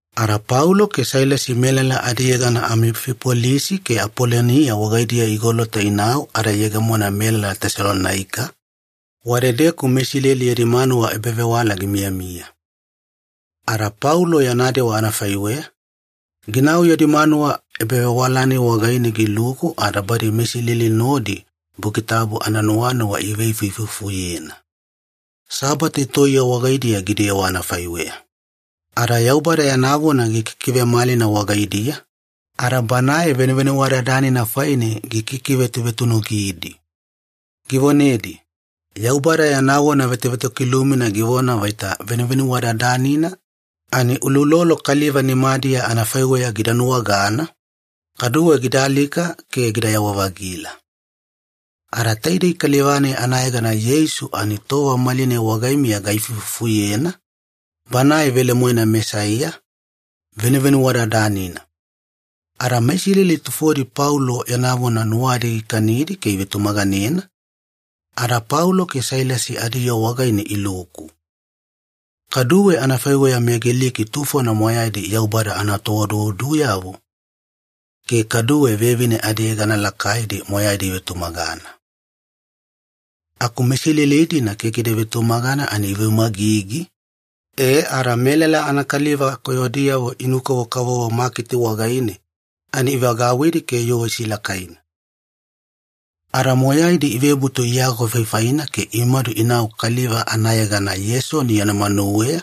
Ada Paulo ke Sailasi melala adiyegana Amifipolisi ke Apolonia wagaidiya igolota inau ada iyegemona melala Tesalonaika, wadedeku meIsileli yadi manuwa ebavewala gimiyamiya. Ada Paulo yana dewa anafaiweya, ginau yadi manuwa ebavewala-nai wagaine giluku ada badi meIsileli nodi Buki Tabu ananuwanuwa iveifuifufuyena. Sabate toiye wagaidiya gidewa anafaiweya. Ada Yaubada yana vona gikikivemalina wagaidiya, ada Banae Venuvenuwadadanina faine gikikivetuvetunugidi. Givonedi, “Yaubada yana vona vetovetokilumina givona vaita Venuvenuwadadanina ani uloulolo kaliva nimadiya anafaiweya gida nuwagana, kaduwe gida alika ke gidayawa-vagila. Ada taidei kaliva-nai anayegana Yeisu ani tova malinai wagaimiya gaifuifufuyena, Banae velemoena Mesaiya, Venuvenuwadadanina.” Ada meIsileli tufodi Paulo yana vona nuwadi gikanidi ke ivetumaganena, ada Paulo ke Sailasi adiyoo wagaine iluku. Kaduwe anafaiweya meGiliki tufona moyaidi Yaubada anatooduoduyavo, ke kaduwe vevine adiyegana lakaidi moyaidi ivetumagana. Aku meIsileli-dina keke ida vetumagana ani iveumagigi, e ada melala anakaliva koyodiyavo inu-kavokavovo maketi wagaine ani ivagauwidi ke yoo isilakaina. Ada moyaidi ivebutu iagofaifaina ke imadu inau kaliva anayegana Yesoni yana manuweya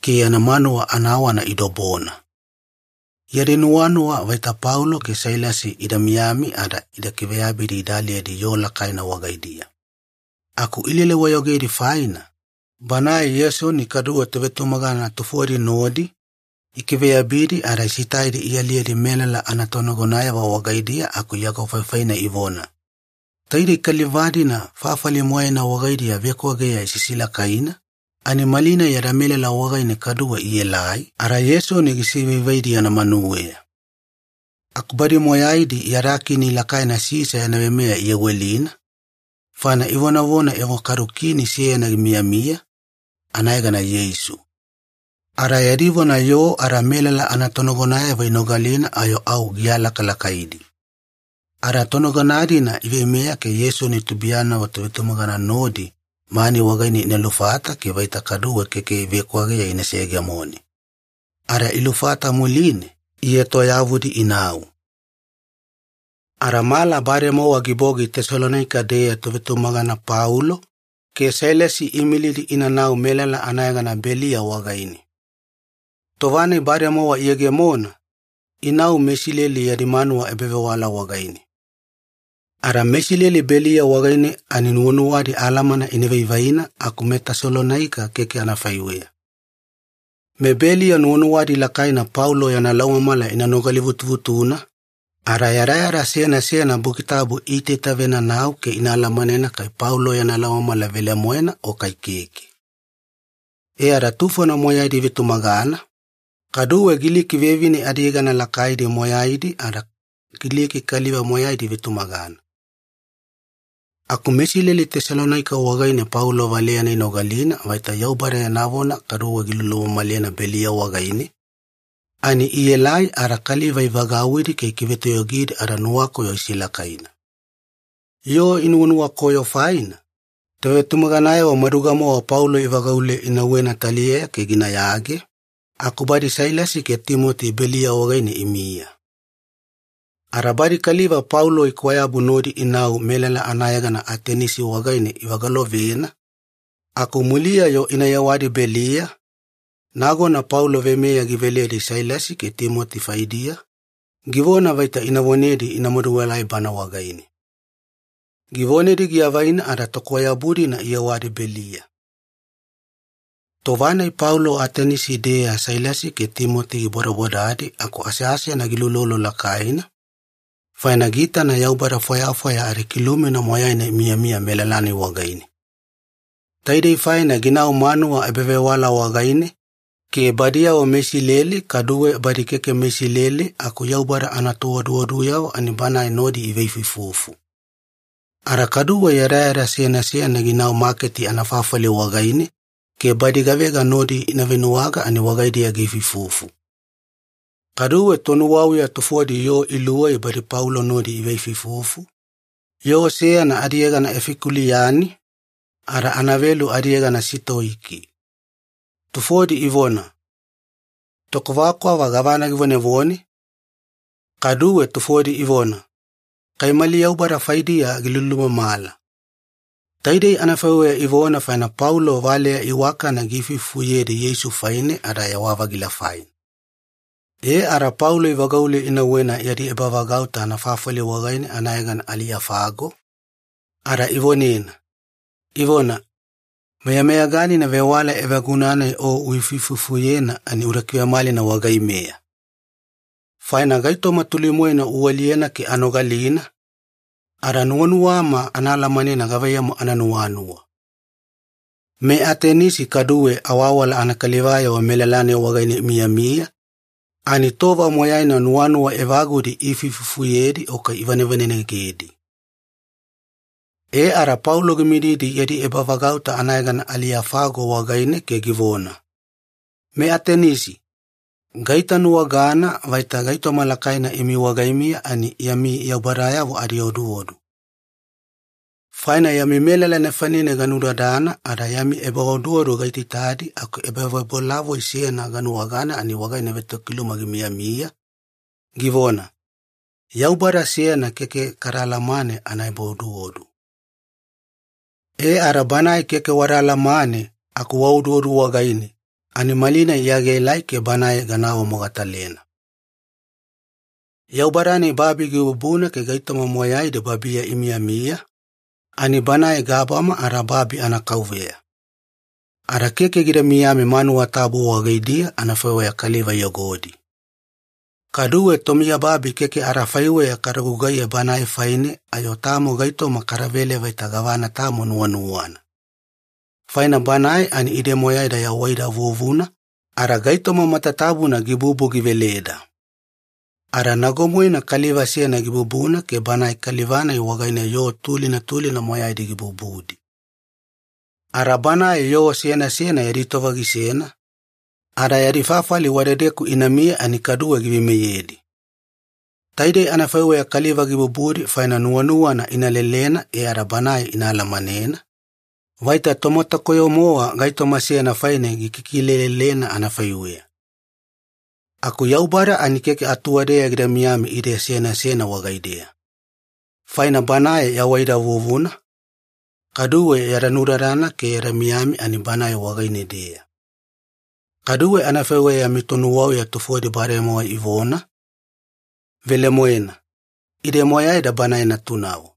ke yana manuwa anawana idobona. Yadi nuwanuwa vaita Paulo ke Sailasi ida miyami ada ida kiveyabidi ida aliyedi yoo lakaina wagaidiya. Aku ilele-wayogedi faina, banae Yesoni kaduwe tovetumagana tufodi nodi ikiveyabidi ada isitaidi ialiyedi melala anatonagonayavo wagaidiya aku iagofaifaina ivona, “Taidei kaliva-dina fafali moyaina wagaidiya vekwageya isisilakaina, ani malinai yada melala wagaine kaduwe ielai ada Yesoni gisivaivaidi yana manuweya. Aku badi moyaidi yada kini lakaina Sisa yana veimeya iyawelina, faina ivonavona evo kadu kini seyana gimiyamiya, anayegana Yeisu.” Ada yadi vona yoo ada melala anatonagonayavo inogalina ayo au gialakalakaidi. Ada tonagona-dina iveimeya ke Yesoni tubuiyanavo tovetumagana nodi mani wagaine ina lufata ke vaita keke kaduwe vekwageya ina seyegemone. Ada ilufata muline, ietoyavudi inau. Ada mala bademowa gibogi Tesalonaika-deya tovetumagana Paulo ke Sailasi iimilidi inanau melala anayegana Beliya wagaine. Tova-nai bademowa iyegemona, inau meIsileli yadi manuwa ebavewala wagaine. Ada meIsileli Beliya wagaine ani nuwanuwadi alamana ina vaivaina, aku meTesalonaika keke anafaiweya. MeBeliya nuwanuwadi lakaina Paulo yana laumamala ina nogalivutuvutuna, ada yadayada seyana seyana Buki Tabu iitaitavenanau ke ina alamanena kai Paulo yana laumamala velemoena o kai keke. E ada tufona moyaidi ivetumagana, kaduwe Giliki vevine adiyegana lakaidi moyaidi ada Giliki kaliva moyaidi ivetumagana. Aku meIsileli Tesalonaika wagaine Paulo valeyana inogalina vaita Yaubada yana vona kaduwe gilulumamalena Beliya wagaine, ani ielai ada kaliva ivagauwidi ke ikivetoyogidi ada nuwakoyo isilakaina. Yoo inuwanuwakoyo faina, tovetumaganayavo maduga-mowa Paulo ivagaule inauwena taliyeya ke ginayage, aku badi Sailasi ke Timoti Beliya wagaine imiya. Ada badi kaliva Paulo ikwayabu nodi inau melala anayegana Atenisi wagaine ivagalovena, aku muliya-yo ina yewadi Beliya, nagona Paulo veimeya giveledi Sailasi ke Timoti faidiya, givona vaita ina vonedi ina maduelai bana wagaine. Givonedi giavaina ada tokwayabu-dina iyewadi Beliya. Tova-nai Paulo Atenisi-deya Sailasi ke Timoti gibodabodadi aku aseasena giulolo lakaina, faina giitana yaubada fwayafwaya adikilumina moyaina imiyamiya melala-nai wagaine. Taidei faina ginau manuwa ebavewala wagaine ke badiyavo meIsileli kaduwe badi keke meIsileli aku Yaubada anatooduoduyavo ani banae nodi iveifuifufu. Ada kaduwe yadayada seyana seyana ginau maketi anafafali wagaine ke badi gavega nodi ina venuwaga ani wagaidiya giifuifufu. Kaduwe tonuwauya tufodi yoo iluwei badi Paulo nodi iveifuifufu, yoo seyana adiyegana Efikuliyani, ada anavelu adiyegana Sitoiki. Tufodi ivona, “Tokwavakwava gavana givonevone?” Kaduwe tufodi ivona, “Kai mali yaubada faidiya gilulumamala.” Taidei anafaiweya ivona faina Paulo valeya iwakana giifuifufuyedi Yeisu faine ada yawa-vagila faina. E ada Paulo ivagaule inauwena yadi ebavagauta anafafali wagaine anayegana Aliyofago, ada ivonena, ivona, “Meyameyaganina vewala evaguna-nai o uifuifufuyena ani uda kivemalina wagaimeya. Faina gaitoma tuli-moena ualiyena ke anogalina, ada nuwanuwama ana alamanena gavaiyamu ananuwanuwa.” MeAtenisi kaduwe awawala anakalivayavo melala-nai wagaine imiyamiya ani tova moyaina nuwanuwa evagudi iifuifufuyedi o kai ivanevanenegedi. E ada Paulo gimididi yadi ebavagauta anayegana Aliyofago wagaine ke givona, “MeAtenisi, gaitanuwagana vaita gaitoma lakaina imi wagaimiya ani yami yaubadayavo adioduodu. Faina yami melala nefanine ganunudadana ada yami ebaoduodu gaitaitadi aku ebavebolavoi seyana ganuwagana ani wagaine vetokiluma gimiyamiya, givona, YAUBADA SEYANA KEKE KADA ALAMANE ANAEBAODUODU. E ada Banae keke wada alamane aku waoduodu wagaine, ani malinai Iya gaelai ke Banae gana awamogatalena. “Yaubada-nai babi gibubuna ke gaitoma moyaidi babiya imiyamiya, ani Banae gabama ada babi anaKauveya. Ada keke gida miyami manuwa tabu wagaidiya anafaiweya kaliva iyogodi. Kaduwe tomiyababi keke adafaiweya kada gugaiye Banae faine ayo tamo gaitoma kadavele vaita gavana tamo nuwanuwana. Faina Banae ani ide moyaida yawaida vuvuna ada gaitoma matatabuna gibubu giveleda. Ada nago-moena kaliva seyana gibubuna ke banae kaliva-nai wagaine yoo tulina tulina moyaidi gibubudi. Ada Banae yoo seyana seyana yadi tova gisena, ada yadi fafali wadedeku inamiya ani kaduwe giveimeyedi. Taidei anafaiweya kaliva gibubudi faina nuwanuwana ina lelena e ada Banae ina alamanena, vaita tomatakoyo-mowa gaitoma seyana faine gikikilelelena anafaiweya. Aku Yaubada ani keke atuwadeya gida miyami ide seyana seyana wagaideya. Faina ‘Banae yawaida vuvuna, kaduwe yada nudadana ke yada miyami ani Banae wagaine-deya.’ Kaduwe anafaiweya yami tonuwauya tufodi bademowa ivona, ‘Velemoena, ide moyaida Banae natunavo.’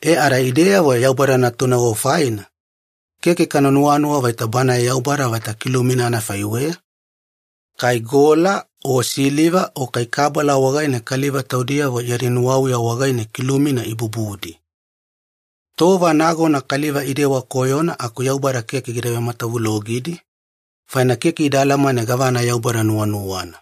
“E ada ideyavo Yaubada natunavo faina, keke kana nuwanuwa vaita Banae Yaubada vaita kilumina anafaiweya, kai gola o siliva o kai kabala wagaine kaliva taudiyavo yadi nuwauya wagaine kilumina ibubudi. Tova nagona kaliva idewa koyona aku Yaubada keke gida vematavulogidi, faina keke ida alamane gavana Yaubada nuwanuwana.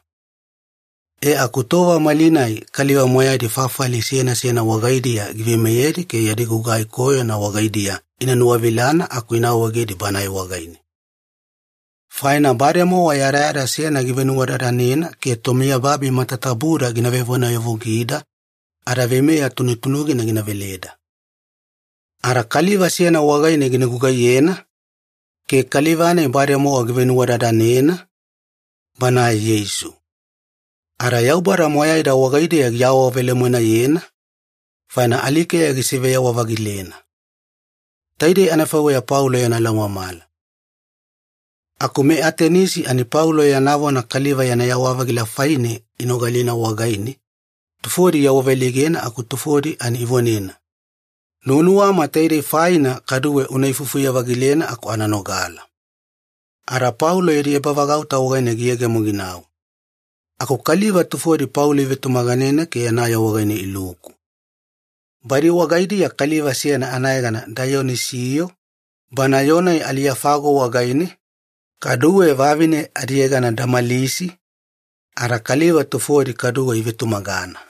E aku tova malinai kaliva moyaidi fafali seyana seyana wagaidiya giveimeyedi ke yadi gugai koyona wagaidiya ina nuwavilana aku ina awaegedi Banae wagaine. Faina bademowa yadayada seyana givenuwadadanena ke tomiyababi matatabuda gina vevonayavugida ada veimeya tunutunugina gina veleda. Ada Kaliva seyana wagaine gina gugaiyena, ke Kaliva-nai bademowa givenuwadadanena, Banae Yeisu. Ada Yaubada moyaida wagaideya giawavelemoenayena, faina alikeya gisiveyawa-vagilena.” Taidei anafaiweya Paulo yana laumamala. Aku MeAtenisi ani Paulo yana vona kaliva yana yawa-vagila faine inogalina wagaine, tufodi iawaveleigena aku tufodi ani ivonena, “Nuwanuwama taidei faina kaduwe una ifufuye-vagilena aku ana nogala.” Ada Paulo yadi ebavagauta wagaine giyegemo ginau. Aku kaliva tufodi Paulo ivetumaganena ke yana yoo wagaine iluku. Badi wagaidiya kaliva seyana anayegana Daiyonisiyo, bana yoo-nai Aliyofago wagaine, kaduwe vavine adiyegana Damalisi, ada kaliva tufodi kaduwe ivetumagana.